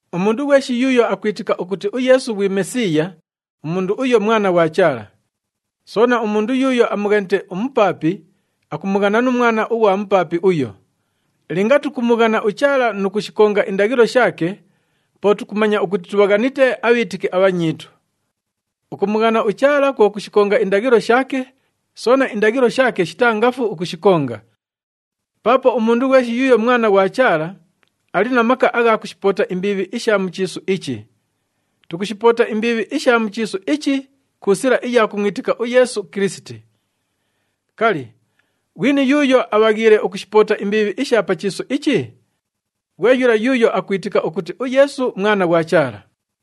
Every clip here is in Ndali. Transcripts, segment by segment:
Umundu ghweshi yuuyo akwitika ukuti uYeesu ghwi Mesiiya, umundu uyo mwana ghwa Chaala. Soona, umundu yuuyo amughanite umupaapi, akumughana nu mwana ughwa mupaapi uyo. Linga tukumughana uChaala nu kushikonga indaghilo shaake, po tukumanya ukuti tubhaghanite abhiitiki abhanyiitu. Ukumughana uChaala kwo kushikonga indaghilo shaake, soona indaghilo shaake shitaa ngafu ukushikonga. Paapo umundu ghweshi yuuyo mwana ghwa Chaala, ali na maka agha kushipoota imbiibhi isha mu chiisu ichi. Tukushipoota imbiibhi isha mu chiisu ichi ku sila iya kumwitika uYeesu Kilisiti. Kali, ghwini yuuyo abhaghiile ukushipoota imbiibhi isha pa chiisu ichi? Ghwe yula yuuyo akwitika ukuti uYeesu Mwana ghwa Chaala.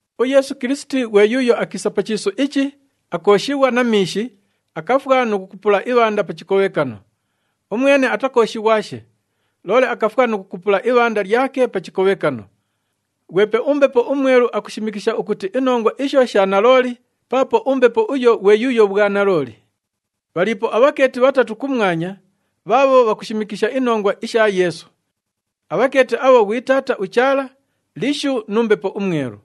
UYeesu Kilisiti ghwe yuuyo akiisa pa chiisu ichi, akooshighwa na miishi, akafwa nu kukupula ibhanda pa chikobhekano. Umwene atakooshighwashe, loole akafwa nu kukupula ibhanda lyake pa chikobhekano. Ghwepe uMbepo uMwelu akushimikisha ukuti inongwa isho sha nalooli paapo uMbepo uyo ghwe yuuyo bhwanalooli. Bhaliipo abhakeeti bhatatu [kumwanya bhaabho bhakushimikisha inongwa isha Yeesu. Abhakeeti abho ghwi Taata uChaala, Lishu nu Mbepo uMwelu.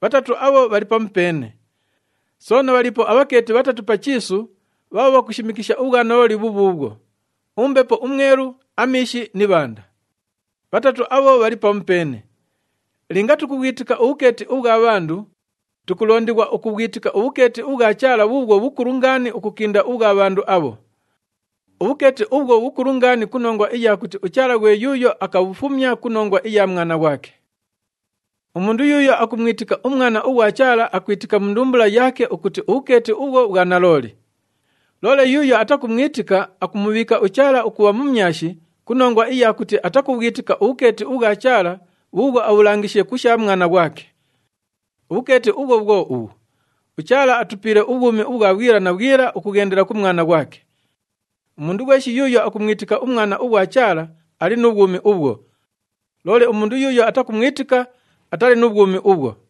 Bhatatu abho bhali pamupeene. Soona bhaliipo abhakeeti bhatatu pa chiisu bhaabho bhakushimikisha ubhwanalooli bhubhuubhwo], uMbepo uMwelu, amiishi ni ibhanda. Bhatatu abho bhali pamupeene. Linga tukubhwitika ubhukeeti ubhwa bhandu, tukulondighwa ukubhwitika ubhukeeti ubhwa Chaala bhuubhwo bhukulu ngaani ukukinda ubhwa bhandu abho. Ubhukeeti ubhwo bhukulu ngaani ku nongwa iya kuti uChaala ghwe yuuyo akabhufumya ku nongwa iya Mwana ghwake. Umundu yuuyo akumwitika uMwana ughwa Chaala akwitika mu ndumbula yaake ukuti ubhukeeti ubhwo bhwa nalooli. Loole yuuyo atakumwitika, akumubhiika uChaala ukubha mumyashi ku nongwa iya kuti atakubhwitika ubhukeeti ubhwa Chaala bhuubhwo abhulangishiishe ku sha Mwana ghwake. Ubhukeeti ubhwo bhwo ubhu, uChaala atupiile ubhwumi ubhwa bhwila na bhwila ukughendela ku Mwana ghwake. Umundu ghweshi yuuyo akumwitika uMwana ughwa Chaala, ali nu bhwumi ubhwo. Loole umundu yuuyo atakumwitika, atali nu bhwumi ubhwo.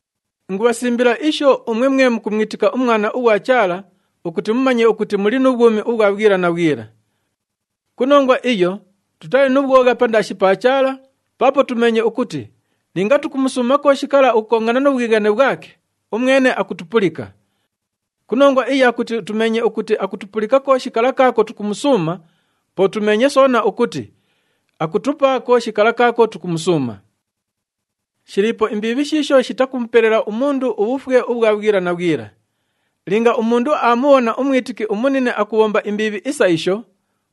Ingubhasimbila isho umwe mwe mukumwitika uMwana ughwa Chaala ukuti mumanye ukuti muli nu bhwumi ubhwa bhwila na bhwila. Ku nongwa iyo, tutali nu bhwogha pandaashi pa Chaala paapo tumeenye ukuti linga tukumusuuma kooshi kala ukukongana nu bhwighane bhwake, umwene akutupulika. Ku nongwa iya kuti tumeenye ukuti akutupulika kooshi kala kaako tukumusuuma, po tumeenye soona ukuti akutupa kooshi kala kaako tukumusuuma. Shiliipo imbiibhi shiisho shitakumupelela umundu ubhufwe ubhwa bhwila na bhwila. Linga umundu aamubhona umwitiki umunine akubhomba imbiibhi isa isho,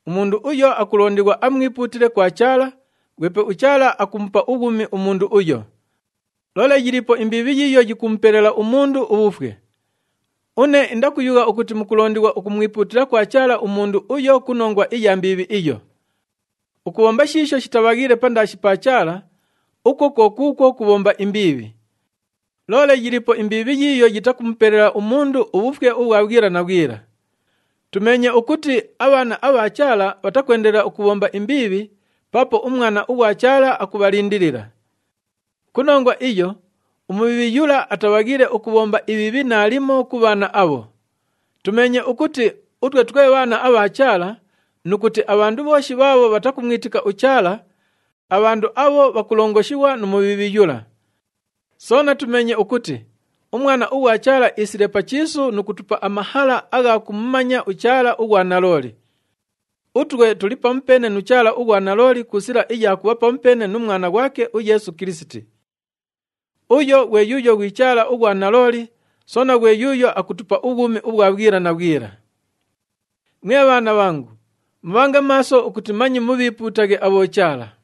umundu uyo akulondighwa amwipuutile kwa Chaala, ghwepe uChaala akumupa ubhwumi umundu uyo. Loole yiliipo imbiibhi yiiyo yikumupelela umundu ubhufwe. Une indakuyugha ukuti mukulondighwa ukumwipuutila kwa Chaala umundu uyo ku nongwa iya mbiibhi iyo. Ukubhomba shiisho shitabhaghiile pandaashi pa Chaala, ukwo kwo kuukwo kubhomba imbiibhi. Loole yiliipo imbiibhi yiiyo yitakumupelela umundu ubhufwe ubhwa bhwila na bhwila. Tumeenye ukuti abhaana abha Chaala bhatakwendelela ukubhomba imbiibhi paapo uMwana ughwa Chaala akubhalindilila. Ku nongwa iyo, uMubhiibhi yula atabhaghiile ukubhomba ibhiibhi naalimo ku bhaana abho. Tumeenye ukuti utwe twe bhaana abha Chaala nu kuti abhandu bhooshi bhaabho bhatakumwitika uChaala, abhandu abho bhakulongoshighwa nu Mubhiibhi yula. Soona tumeenye ukuti uMwana ughwa Chaala iisile pa chiisu nu kutupa amahala agha kumumanya uChaala ughwa nalooli. Utwe tuli pamupeene nu Chaala ughwa nalooli ku sila iya kubha pamupeene nu Mwana ghwake uYeesu Kilisiti. Uyo ghwe yuuyo ghwi Chaala ughwa nalooli soona ghwe yuuyo akutupa ubhwumi ubhwa bhwila na bhwila. Mwe bhaana bhangu, mubhange maaso ukuti manye mubhiipuutaghe abhochaala.